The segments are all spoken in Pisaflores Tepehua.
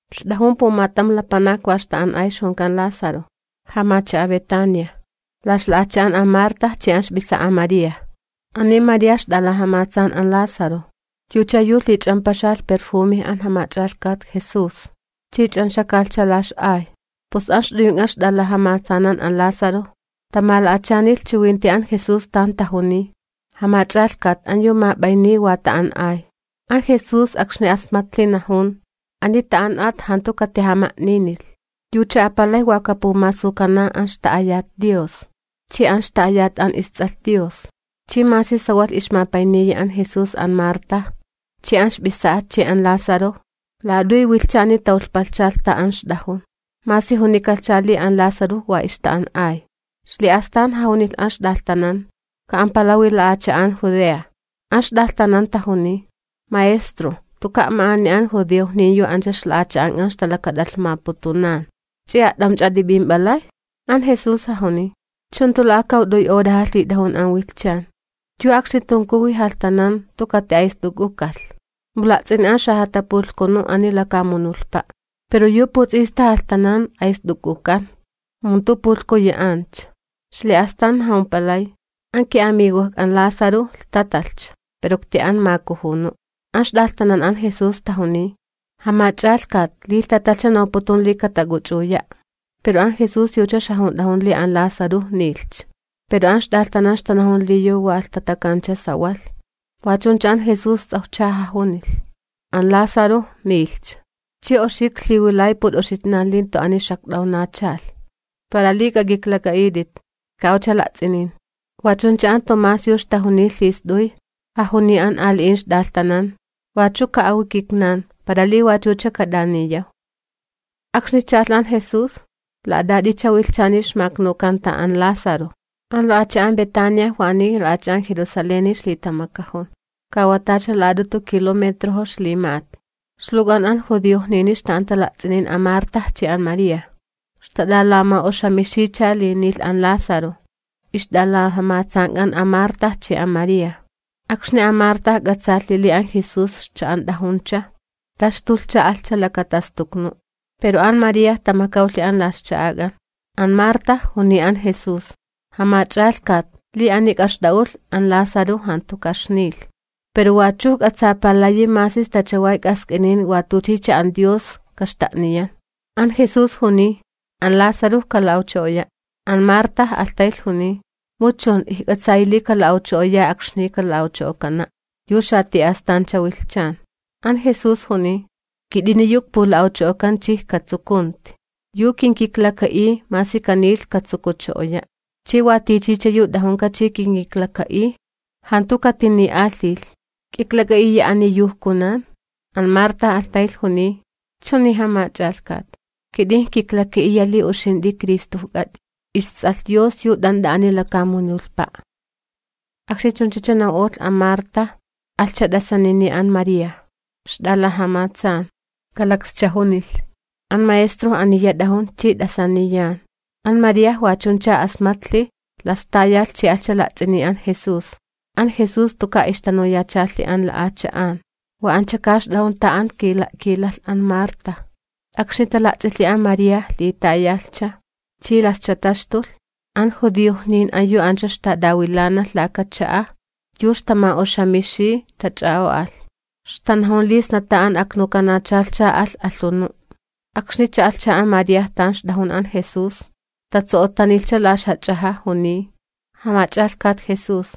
Ixt'ajun pumatam lapanak wa ixta'an'ay ixjunkan Lázaro, jamacha'a Betania, la ixla'acha'an an Marta chi an ixp'isa'a María. Ani María ixt'alajamatsan an Lázaro, yucha yu lhich'ampaxalh perjume an Jamach'alhkat Jesús chi ch'anxakalhcha la ix'ay. Pus an ixt'uyunk'an ixt'alajamatsanan an Lázaro, tamala'achanilhi chiwinti an Jesús tan tajuniy: ―Jamach'alhkat, an yu map'ayniy wa ta'an'ay. An Jesús, akxni asmatlhi, najun: ―Ani ta'an'at jantu katijama'ninilh, yucha apalij wa kapumasukana an ixta'ayat Dios, chi an ixta'ayat an isTs'alh Dios. Chi masi sawalh ixmapayniya an Jesús an Marta, chi an ixp'isa'a chi an Lázaro, la'at'uy wilhchani tamakawpalhchalh an tan ixt'ajun masi junikalhcha li an Lázaro wa ixta'an'ay. Ixli'astan jajunilh an ixt'alhtanan: ―Ka'ampalawi xalakaat'un Judea. An ixt'alhtanan tajuniy: ―Maestro, jantuka' ma'ani an judiojnin ancha ixtalakat'alhmaputunacha'an, ¿ch'i a't'amch'a t'ip'imp'alay? An Jesús jajuniy: ―¿Chu jantu la'akawt'uy horaja lhit'ajun an wilhchan? Yu akxni tunkuwi jalhtanan jantu kati'ayst'uk'ukalh, mu la'ts'ini an xajatapulhkunu ani lakamunulhpa'. Pero yu puts'ista jalhtanan, ayst'uk'ukan, mu jantu pulhkuyi ancha. Ixli'astan jajumpalay: ―An ki'amigojk'an Lázaro lhtatalhcha, pero ikti'an makujunu'. An ixt'alhtanan an Jesús tajuniy: ―Jamach'alhkat, li lhtatalhcha, nawputun li katak'uch'uya'. Pero an Jesús yucha ixjajunt'ajun li an Lázaro nilhcha, pero an ixt'alhtanan ixtanajun li yu wa lhtatakancha sawalh. Wa chuncha an Jesús ts'awjcha jajunilh: ―An Lázaro nilhcha, chi oxi iklhiwilay milakatak'an uxitnan li jantu ani xakt'awnachalh para li k'ak'iklak'a'it'it. Ka'awcha la'ts'inin. Wa chuncha an Tomás yu ixtajuniy lhist'uy, jajuniy an ali'in ixt'alhtanan: ―Wachu ka'awi kitnan, para li wachucha kat'aniyaw. Akxni cha'alh an Jesús, la'at'at'icha wilhchani ixmaknukanta an Lázaro. An la'acha'an Betania waniy la'acha'an Jerusaleni ixlitamakajun, ka wa tacha la'at'utu kilometrojo ixlima'at. Ixluwk'an an judiojnini ixta'anta la'ts'inin an Marta chi an María, ixtat'alama'oxamixiycha li nilh an Lázaro ixt'alajamatsank'an an Marta chi an María. Akxni an Marta k'atsaalhi li an Jesús ixcha'ant'ajuncha, taxtulhcha, alhcha lakatastuknu'. Pero an María tamakawlhi an la ixcha'ak'an. An Marta juniy an Jesús: ―Jamach'alhkat, li ani k'axt'a'ulh, an Lázaro jantu kaxnilh. Pero wachu ijk'atsapalayi masi sta chaway k'ask'inin watuchicha an Dios, kaxta'niyan. An Jesús juniy: ―An Lázaro kala'awcho'oya'. An Marta alhtaylh juniy: ―Mu chun, ijk'atsayi li kala'awcho'oya akxni kala'awcho'okana', yu xati'astancha wilhchan. An Jesús juniy: ―Kit'ini yu ikpula'awcho'okan chi ijkatsukunti. Yu kinkiklaka'iy, masi kanilh, katsukucho'oya'. Chi wa tichicha yu t'ajunka chi kinkiklaka'iy, jantu katini'alhilh. ¿K'iklak'a'iya ani yu ijkunan? An Marta alhtaylh juniy: ―Chuni, Jamach'alhkat, kit'in ijkiklaka'iya li uxint'i Cristojk'at'i, isTs'alh Dios, yu t'ant'a ani lakamunulhpa'. Akxni chunchacha naw'olh an Marta, alhcha t'asanini an María, ixt'alajamatsan, kalakscha junilh: ―An Maestro aniya t'ajun chi t'asaniyan. An María wa chuncha asmatlhi, las tayalh chi alhcha la'ts'ini an Jesús. An Jesús jantuka' ixtanuyachalhi an la'acha'an. Wa anchaka ixt'ajun tan an kila'kilalh an Marta. Akxni tala'ts'ilhi an María li tayalhcha, chi lascha taxtulh, an judiojnin an yu ancha ixtat'awilanalh laka cha'a yu ixtama'oxamixiy tach'a'o'alh, ixtanajun li sna an tan aknukanachalhcha alh alhunu'. Akxni cha'alhcha an María tan ixt'ajun an Jesús, tatso'ottanilhcha la ixjach'aja', juniy: ―Jamach'alhkat Jesús,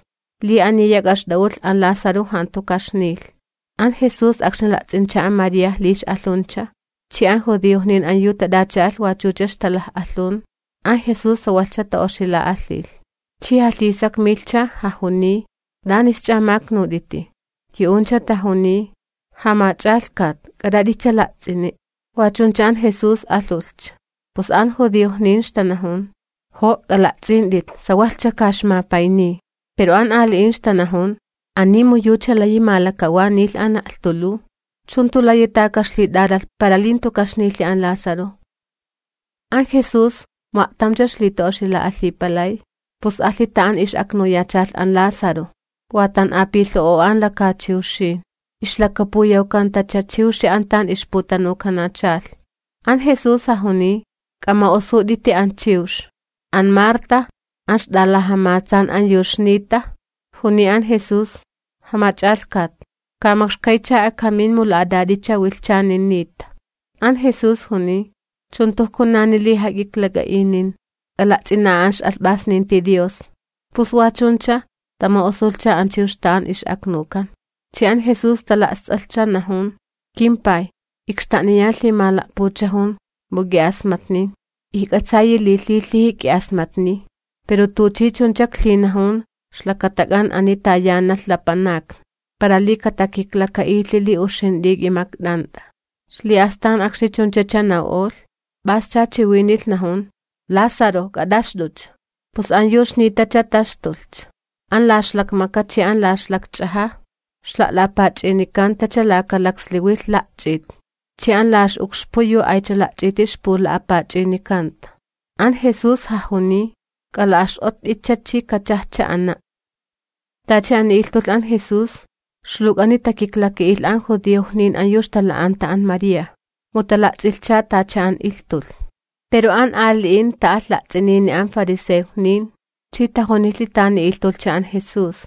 li ani k'a'ixt'a'ulh, an Lázaro jantu ka'ixnilh. An Jesús akxni la'ts'incha an María li ix'alhuncha chi an judiojnin an yu tat'acha'alh wachucha ixtalaj'alhun, an Jesús sawalhcha ta'oxila'alhilh. Chi jalhisakmilhcha, jajuniy: ―¿T'anisch'a maknut'it? Yu'uncha tajuniy: ―Jamach'alhkat, k'at'at'icha la'ts'ini'. Wa chuncha an Jesús alhulhcha. Pus an judiojnin ixtanajun: ―¡Jo' k'ala'ts'int'it, sawalhcha ka ixmapayniy! Pero an ali'in ixtanajun: ―Ani mu yucha layi malakawanilh an la'lhtuluw, ¿chu jantu layi ta ka'ixlit'alalh para li jantu ka'ixnilhi an Lázaro? An Jesús, mu a'tamcha ixlita'oxila'alhipalay, pus alhi an tan ix'aknuyachalh an Lázaro. Wa tan'apilho'o'o an lakachiwxin, ixlakapuyawkantacha chiwxi an tan ixputanukanachalh. An Jesús jajuniy: ―K'ama'osut'iti an chiwx. An Marta, an ixt'alajamatsan an yu ixniytacha, juniy an Jesús: ―Jamach'alhkat, ka makxkaycha akamin, mu la'at'at'icha wilhchani niyta. An Jesús juniy: ―¿Chu jantu ijkunani li jak'iklak'a'inin, k'ala'ts'ina'a an ix'alhp'asninti Dios? Pus wa chuncha tama'osulhcha an chiwx an tan ix'aknukan, chi an Jesús tala'st'alhcha, najun: ―KimPay ikxta'niyan lhimala'puchajun, mu k'i'asmatnin. Ijk'atsayi li lhilhiji k'i'asmatniy pero tuchi chuncha iklhinajun ixlakatak'an ani tayanalh lapanakni, para li katakiklaka'ilhi li uxint'i k'imakt'ant'a. Ixli'astan akxni chunchacha naw'olh, p'ascha chiwinilh, najun: ―¡Lázaro, k'at'axt'ucha! Pus an yu ixnitacha taxtulhcha, an la ixlakmaka chi an la ixlakch'aja ixla'la'apach'inikantacha laka laksliwilh la'ch'it chi an la ix'ukxpu yu aycha la'ch'iti ixpula'apach'inikanta. An Jesús jajuniy: ―K'ala'ax'ott'itcha chi kachajcha ana'. Tacha ani ilhtulh an Jesús, ixluwk'ani takiklaka'ilh an judiojnin an yu ixtala'cha'anta an María, mu tala'ts'ilhcha tacha an ilhtulh. Pero an ali'in ta'alh la'ts'inini an fariseojnin, chi tajunilhi tani ilhtulhcha an Jesús.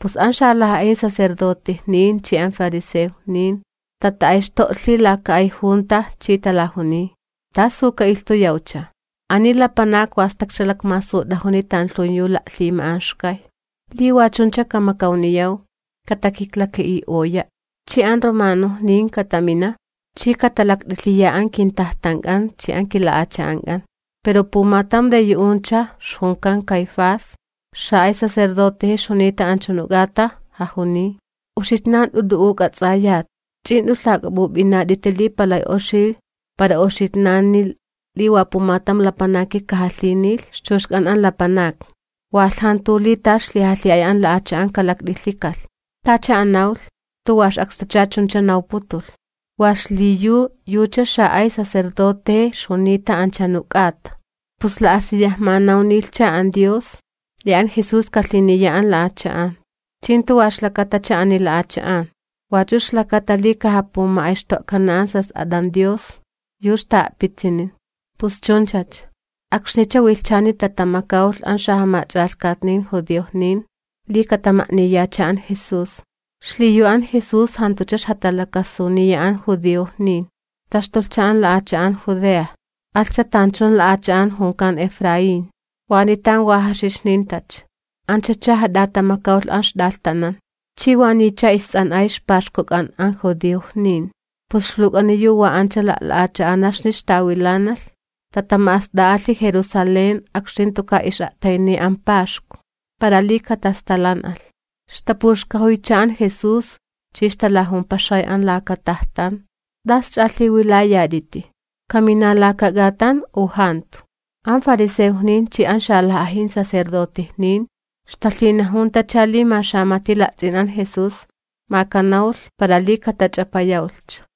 Pus an xalaj'ajin sacerdotejnin chi an fariseojnin tata'ayxto'lhi laka ay junta chi talajuniy: ―¿Tasu ka'ilhtuyawcha? Ani lapanak wa stakcha lakmasut'ajuni tanlhun yu la'lhima'anxkay. Li wa chuncha kamakawniyaw, katakiklaka'i'oya', chi an yu jamacha'an Roma katamina chi katalakt'ilhiya an kintajtank'an chi an kilakaat'unk'an. Pero pumatam yu yu'uncha, ixjunkan Caifás, xa'ay sacerdoteje ixjunita anchunu k'ata, jajuniy: ―Uxitnan jant'u t'u'u k'ats'ayat, ch'i jant'u lhak'ap'up'inat'iti li palay oxi para kitnani li wa pumatam lapanaki kajalhinilh ixchuxk'an an lapanakni, walh jantu li ta ixlijalhi'ay lakwilakalh an kilakaat'unk'an kalakt'ilhikalh. Tacha an nawlh, jantu wa ix'akstucha chuncha nawputulh, wa xliyu yucha xa'ay sacerdoteje ixjunita anchunu k'ata, pus la'asiyaj manawnilhcha an Dios li an Jesús kajalhiniya an ixlapanakni. Chi jantu wa ixlakatacha ani lapanakni, wachu ixlakata li kajapuma'ayxto'kana an ixjas'at'an Dios yu ta'a'pitsinin. Pus chunchacha, akxnicha wilhchani tatamakawlh an xajamach'alhkatni judiojnin li katama'niyacha an Jesús. Xliyu an Jesús jantucha ixjatalakasuniya an judiojnin, taxtulhcha an xalakaat'un Judea, alhcha tanchun la'acha'an junkan Efraín, waniy tan wa jaxixnintacha. Anchacha jat'atamakawlh an ixt'alhtanan. Chi waniycha ists'an'ay ixpaxkuk'an an judiojnin, pus ixluwk'ani yu wa ancha la'la'acha'anaxni ixtawilanalh tatama'ast'a'alhi Jerusalén akxni jantuka' ix'a'tayniy an paxku, para li katastalan'alh. Ixtapuxkajuycha an Jesús chi ixtalajumpaxay an laka tajtan: ―¿T'asch'a lhiwilayat'iti? ¿Kamina laka k'atan u jantu? An fariseojnin chi an xalaj'ajin sacerdotejnin ixtalhinajuntacha li ma xamati la'ts'in an Jesús, ma kanawlh, para li katach'apayawlhcha.